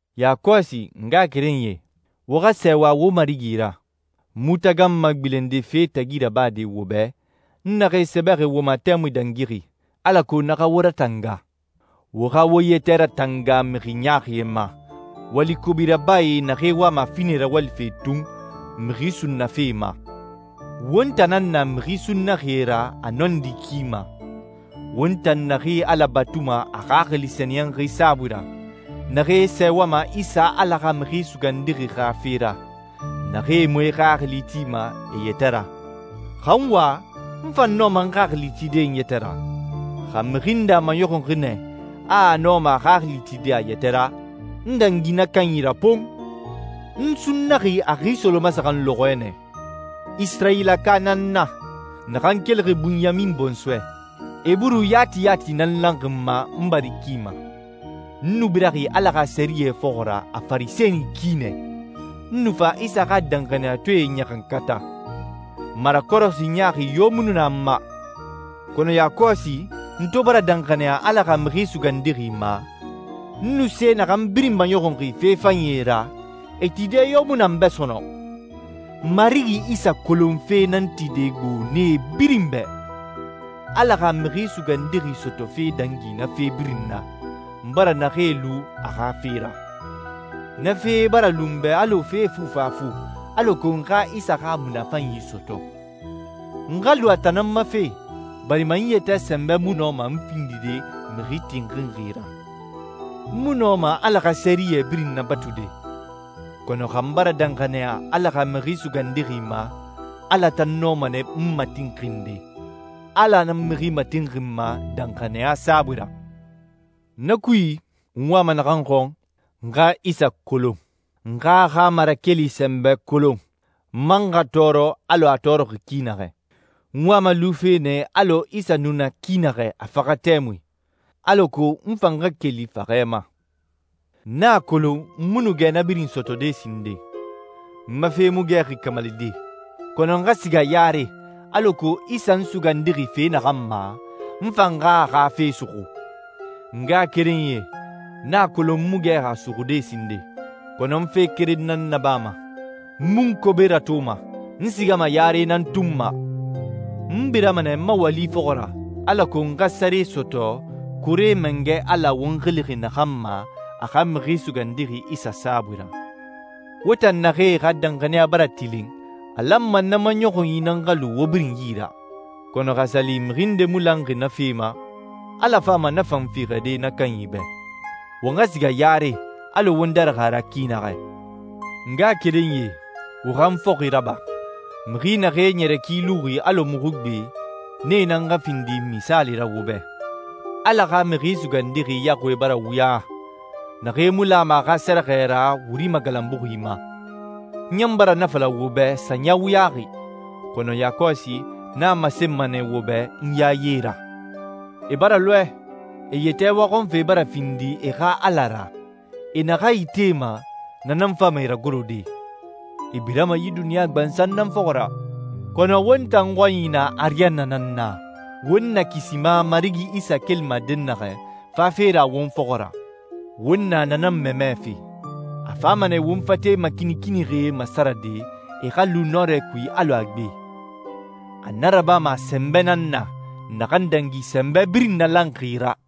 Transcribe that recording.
Yakɔsi, n ngaxakerenyie, wo xa sɛɛwa wo Marigi ra. N mu taganma gbilende fee tagi rabade wo bɛ, n naxee sɛbɛxi wo ma tɛmui dangixi, alako na xa wo ratanga. Wo xa wo yɛtɛ ratanga mixi ɲaaxie ma, wali kobi rabae naxee wama finɛ rawalife tun mixi sunnafe ma. Won tan nan na mixi sunnaxie ra a nɔndi ki ma, won tan naxee Ala batuma a Xaxili Sɛniyɛnxi saabui ra, naxee sɛɛwama Isa Ala xa Mixi Sugandixi xa fe ra, naxee mu e xaxili tima e yɛtɛ ra. Xa n wa, n fan nɔma n xaxili tide n yɛtɛ ra. Xa mixi nde a maɲɔxunxi nɛ a a nɔma a xaxili tide a yɛtɛ ra, n dangi na kanyi ra pon! N sunnaxi a xi solomasaxan lɔxɔɛ nɛ, Isirayilaka nan n na, naxan kelixi Bunyamin bɔnsɔɛ, Eburu yati yati nan lanxi n ma n bari ki ma. N nu biraxi Ala xa sɛriyɛ fɔxɔ ra a Farisɛni ki nɛ, n nu fa Isa xa danxaniyatɔɛe ɲaxankata. Marakɔrɔsi ɲaaxi yo mu nu na n ma. Kɔnɔ yakɔsi, n to bara danxaniya Ala xa Mixi Sugandixi ma, n nu se naxan birin maɲɔxunxi fe fanyie ra, e tide yo mu na n bɛ sɔnɔn. Marigi Isa kolonfe nan tide gbo nee birin bɛ. Ala xa Mixi Sugandixi sɔtɔfe dangi na fe birin na, n bara naxee lu a xa fe ra. Na fee bara lu n bɛ alɔ fee fufafu alako n xa Isa xa munafanyi sɔtɔ. N xa lu a tan nan ma fe, barima n yɛtɛ sɛnbɛ mu nɔma n findide mixi tinxinxi ra. N mu nɔma Ala xa sɛriyɛ birin nabatude. Kɔnɔ xa n bara danxaniya Ala xa Mixi Sugandixi ma, Ala tan nɔma nɛ n matinxinde. Ala nan mixi matinxinma danxaniya saabui ra. Na kui, n wama naxan xɔn, n xa Isa kolon. N xa a xa marakeli sɛnbɛ kolon, n man xa tɔɔrɔ alɔ a tɔɔrɔxi ki naxɛ. N wama lufe nɛ alɔ Isa nu na ki naxɛ a faxa tɛmui, alako n fan xa keli faxɛ ma. N a kolon n mu nu gɛ na birin sɔtɔde sinden, n ma fe mu gɛxi kamalide. Kɔnɔ n xa siga yare alako Isa n sugandixi fe naxan ma, n fan xa a xa fe suxu. N ngaxakerenyie, n a kolon n mu gɛxi a suxude sinden, kɔnɔ n fe keren nan nabama: N mu n kobe ratoma, n sigama yare nan tun ma. N birama nɛ n ma wali fɔxɔ ra, alako n xa sare sɔtɔ Koore Mangɛ Ala won xilixi naxan ma a xa Mixi Sugandixi Isa saabui ra. Won tan naxee xa danxaniya bara tilin, a lanma na maɲɔxunyi nan xa lu won birin yi ra. Kɔnɔ xa a sa li mixi nde mu lanxi na fe ma, Ala fama na fan fiixɛde na kanyi bɛ. Won xa siga yare alɔ won darixi a ra ki naxɛ. N ngaxakerenyie, wo xa n fɔxi raba. Mixi naxee ɲɛrɛ ki luxi alɔ muxu gbe, nee nan xa findi misaali ra wo bɛ. Ala xa Mixi Sugandixi yaxuie bara wuya, naxee mu lama a xa sɛrɛxɛ ra wuri magalanbuxi ma. N ɲan bara na fala wo bɛ sanya wuyaxi, kɔnɔ yakɔsi n a masenma nɛ wo bɛ n yaye ra. E bara lɔɛ. E yɛtɛ waxɔnfe bara findi e xa ala ra. E naxan itema, na nan fama e ragorode. E birama yi duniɲa gbansan nan fɔxɔ ra. Kɔnɔ won tan xɔnyi na ariyanna nan na, won nakisima Marigi Isa kelima dɛnnaxɛ fafe ra won fɔxɔ ra. Won na na nan mamɛfe. A fama nɛ won fate makinikinixie masarade, e xa lu nɔrɛ kui alɔ a gbe. A na rabama a sɛnbɛ nan na, naxan dangi sɛnbɛ birin nalanxi ra.